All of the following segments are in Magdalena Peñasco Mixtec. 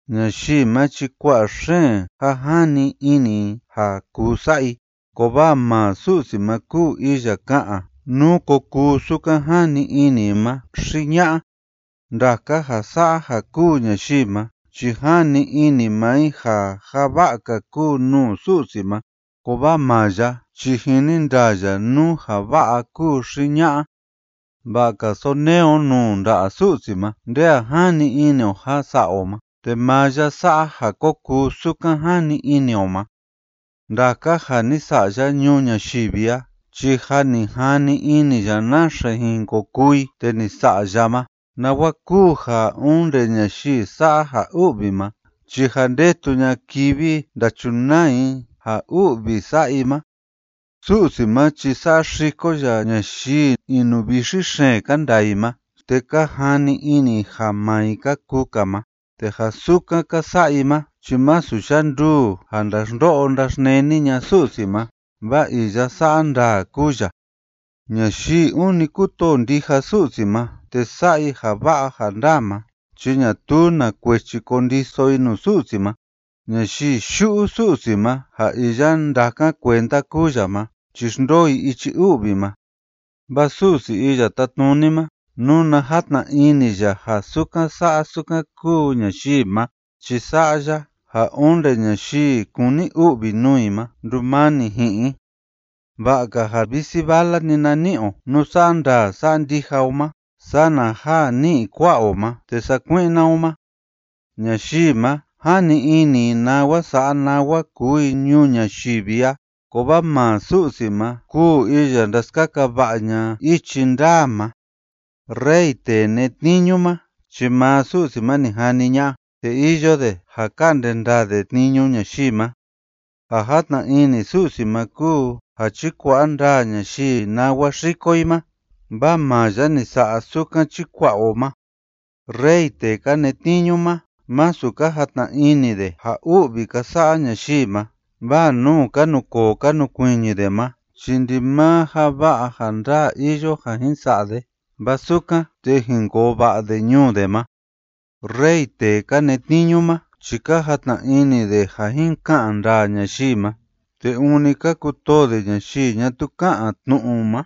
Ñayii ma chi kua'a xeen ja jani ini i ja kuu sa'a i, kovaa maa Su'si ma kúu Iya ka'an nú ko kuu sukan jani ini i ma xi ña'a. Ndaka ja sa'a ja kúu ñayii ma chi jani ini maa i ja ja va'a‑ka kúu nuu Su'si ma, kovaa maa ya chi jini ndaa ya nú ja va'a kúu xi ña'a. Va'a‑ka sonee o nuu nda'a Su'si ma nde a jani ini o ja sa'a o ma te maa ya sa'a ja ko kuu sukan jani ini o ma. Ndaka ja ni sa'a ya ñuu ñayivi a chi jâ ni jani ini ya naxe jin ko kuu i te ni sa'a ya ma, nawa kúu ja onde ñayii sa'a ja u'vi ma chi jâ ndetu ña'a kivi ndachunaa i ja u'vi sa'a i ma. Su'si ma chi saxiko ya ñayii inuvixi xeen ka ndaa i ma te ka jani ini i ja maa i ka kuu‑ka ma, te ja sukan ka sa'a i ma chi masu yanduu ja ndaxndo'o ndaxneni ña'a Su'si ma, vaa iya sa'a ndaa kúu ya. Ñayii ûni kútoo ndija Su'si ma te sa'a i ja va'a ja ndaa ma chi ñatuu na kuechi kondiso i nuu Su'si ma. Ñayii yu'u Su'si ma ja iya ndákan kuenda kúu ya ma chi xndoo i ichi u'vi ma. Vaa Su'si Iya Tátnuni ma, nuna játna ini ya ja sukan sa'a sukan kúu ñayii ma chi sa'a ya ja onde ñayii kúni u'vi nuu i ma ndumani ji'in i. Va'a‑ka ja visi vala‑ni na ni'i o nú sa'a ndaa sa'a ndija o ma sana ja ni'i kua'a o ma te sakui'na o ma. Ñayii ma, jani ini i nawa sa'a nawa kuu i ñuu ñayivi a, kovaa maa Su'si ma kúu iya ndaskaka va'a ña'a ichi ndaa ma. Rey tee netniñu ma chi maa Su'si ma ni jani ña'a, te iyo de ja ka'nde ndaa de tniñu ñayii ma. Ja játna ini Su'si ma kúu ja chikua'a ndaa ñayii nawa xiko i ma, vaa maa ya ni sa'a sukan chikua'a o ma. Rey tee ka netniñu ma, masu ka jatna ini de ja u'vi ka sa'a ñayii ma, vaa nuu ka nukoo ka nukuiñi de ma chi ndimaa ja va'a ja ndaa iyo ja jin sa'a de, vaa sukan, te jin koo va'a de ñuu de ma. Rey tee ka netniñu ma chi ka jatna ini de ja jin ka'an ndaa ñayii ma, te ûni ka kutoo de ñayii ñatuu ká'an tnu'u ma.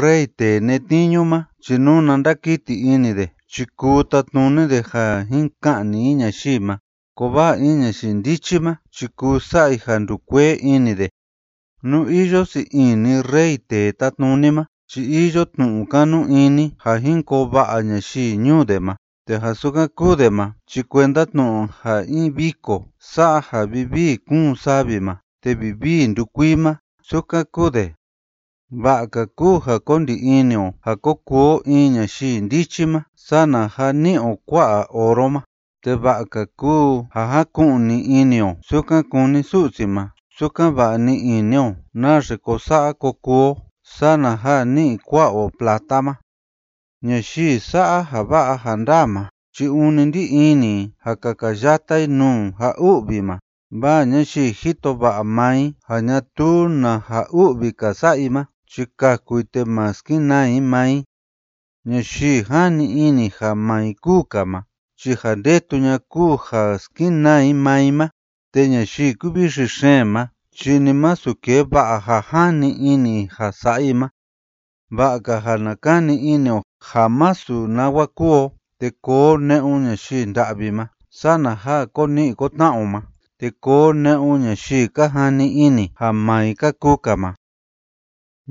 Rey tee netniñu ma chi nuna ndakiti ini de chi kuu tatnuni de ja jin ka'ni i ñayii ma, kovaa in ñayii ndichi ma chi kuu sa'a i ja ndukuee ini de. Nú iyo sii ini rey tee tátnuni ma chi iyo tnu'u kanu ini ja jin koo va'a ñayii ñuu de ma, te ja sukan kúu de ma chi kuenda tnu'u ja in viko sa'a ja vivii kúun savi ma te vivii ndukuii ma, sukan kuu de. Va'a‑ka kúu ja ko ndi ini o ja ko kuu o in ñayii ndichi ma sana ja ni'i o kua'a oro ma, te va'a‑ka kúu ja jáku'ni ini o sukan kúni Su'si ma sukan‑va'a ni'i ini o naxe ko sa'a ko kuu o sana ja ni'i kua'a o plata ma. Ñayii sa'a ja va'a ja ndaa ma chi ûni ndí ini i ja kakayata i nuu ja u'vi ma, vaa ñayii jito va'a maa i ja ñatuu na ja u'vi‑ka sa'a i ma chi kaku i te ma skenaa i maa i. Ñayii jani ini ja maa i kúu‑ka ma chi ja ndetu ña'a kúu ja skenaa i maa i ma, te ñayii kúvixi xeen ma chi ni masu kee va'a ja jani ini i ja sa'a i ma. Va'a‑ka ja na kani ini o ja masu nawa kúu o te koo o ne'un ñayii nda'vi ma, sana ja ko ni'i ko tna'a o ma te koo o ne'un ñayii ka jani ini ja maa i ka kuu‑ka ma.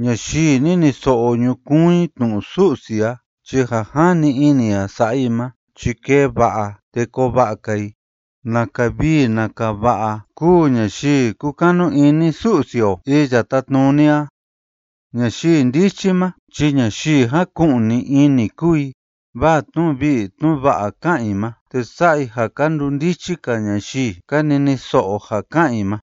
Ñayii niniso'o ñukuun i tnu'u Su'si a chi ja jani ini i ja sa'a i ma chi kee va'a te koo va'a‑ka i. ¡Naka vii naka va'a kúu ñayii kúkanu ini Su'si o Iya Tátnuni a! Ñayii ndichi ma chi ñayii jáku'ni ini kúu i, vaa tnu'u vii tnu'u va'a ká'an i ma, te sa'a i ja ka ndundichi‑ka ñayii ka niniso'o ja ká'an i ma.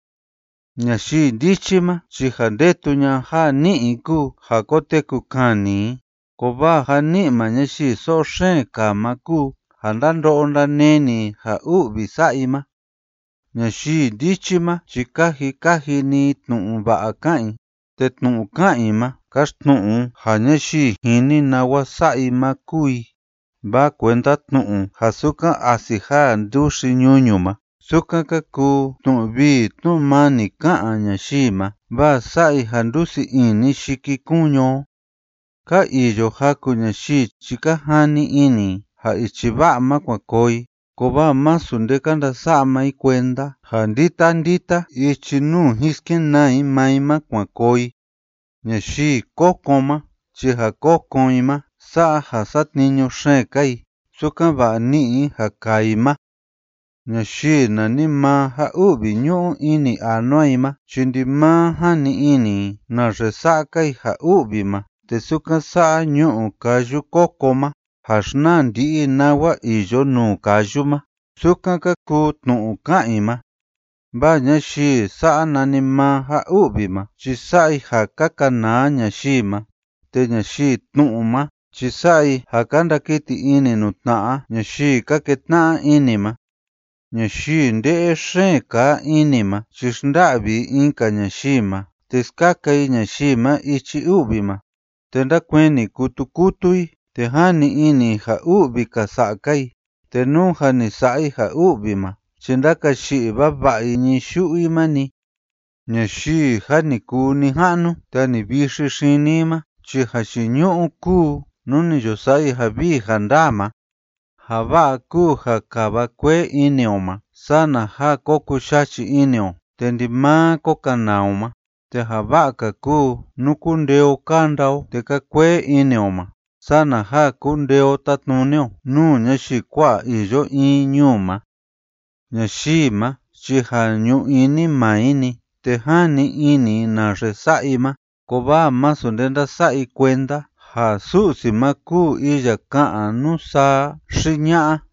Ñayii ndichi ma chi ja ndetu ña'a ja ni'i i kúu ja koteku kani i, kovaa ja ni'i maa ñayii so'o xeen kaa ma kúu ja ndando'o ndaneni i ja u'vi sa'a i ma. Ñayii ndichi ma chi kaji kaji‑ni i tnu'u va'a ká'an i, te tnu'u ká'an i ma káxtnu'u ja ñayii jini nawa sa'a i ma kúu i, vaa kuenda tnu'u ja sukan asi jaa nduxi ñuñu ma, sukan ka kuu tnu'u vii tnu'u mani ká'an ñayii ma, vaa sa'a i ja ndusii ini yikikuñu o. Ka iyo jaku ñayii chi ka jani ini i ja ichi va'a ma kuan koo i, kovaa masu nde ka ndasa'a maa i kuenda ja ndita ndita ichi nuu jin skenaa i maa i ma kuan koo i. Ñayii kokon ma chi ja kokon i ma sa'a ja satniñu xeen‑ka i, sukan‑va'a ni'i i ja kaa i ma. Ñayii nanimaa ja u'vi ñu'u ini anua i ma chi ndimaa jani ini i naxe sa'a‑ka i ja u'vi ma, te sukan sa'a ñu'u káyu kóko ma ja xnaa ndi'i i nawa iyo nuu káyu ma, sukan ka kuu tnu'u ká'an i ma, vaa ñayii sa'a nanimaa ja u'vi ma chi sa'a i ja ka kanaa ñayii ma, te ñayii tnu'u ma chi sa'a i ja ka ndakiti ini nuu tna'a ñayii ka ketna'a ini ma. Ñayii nde'e xeen kaa ini ma chi xnda'vi i in‑ka ñayii ma te skaka i ñayii ma ichi u'vi ma, te ndákueni kutu kutu i te jani ini i ja u'vi‑ka sa'a‑ka i, te nú jâ ni sa'a i ja u'vi ma chi ndákayi'i vava'a i ñii yu'u i ma‑ni. Ñayii jâ ni kuu nija'nu te jâ ni vixi xini i ma chi jayiñu'u kúu nú ni yo sa'a i ja vii ja ndaa ma. Ja va'a kúu ja kava kuee ini o ma sana ja ko kuyachi ini o te ndimaa ko kanaa o ma, te ja va'a‑ka kúu nú kúndee o kánda o te kaa kuee ini o ma sana ja kundee o tatnuni o nuu ñayii kua'a iyo in ñuu ma. Ñayii ma chi ja ñu ini maa i‑ni te jani ini i naxe sa'a i ma, kovaa masu nde ndása'a i kuenda ja Su'si ma kúu iya ka'an nú saa xi ña'a.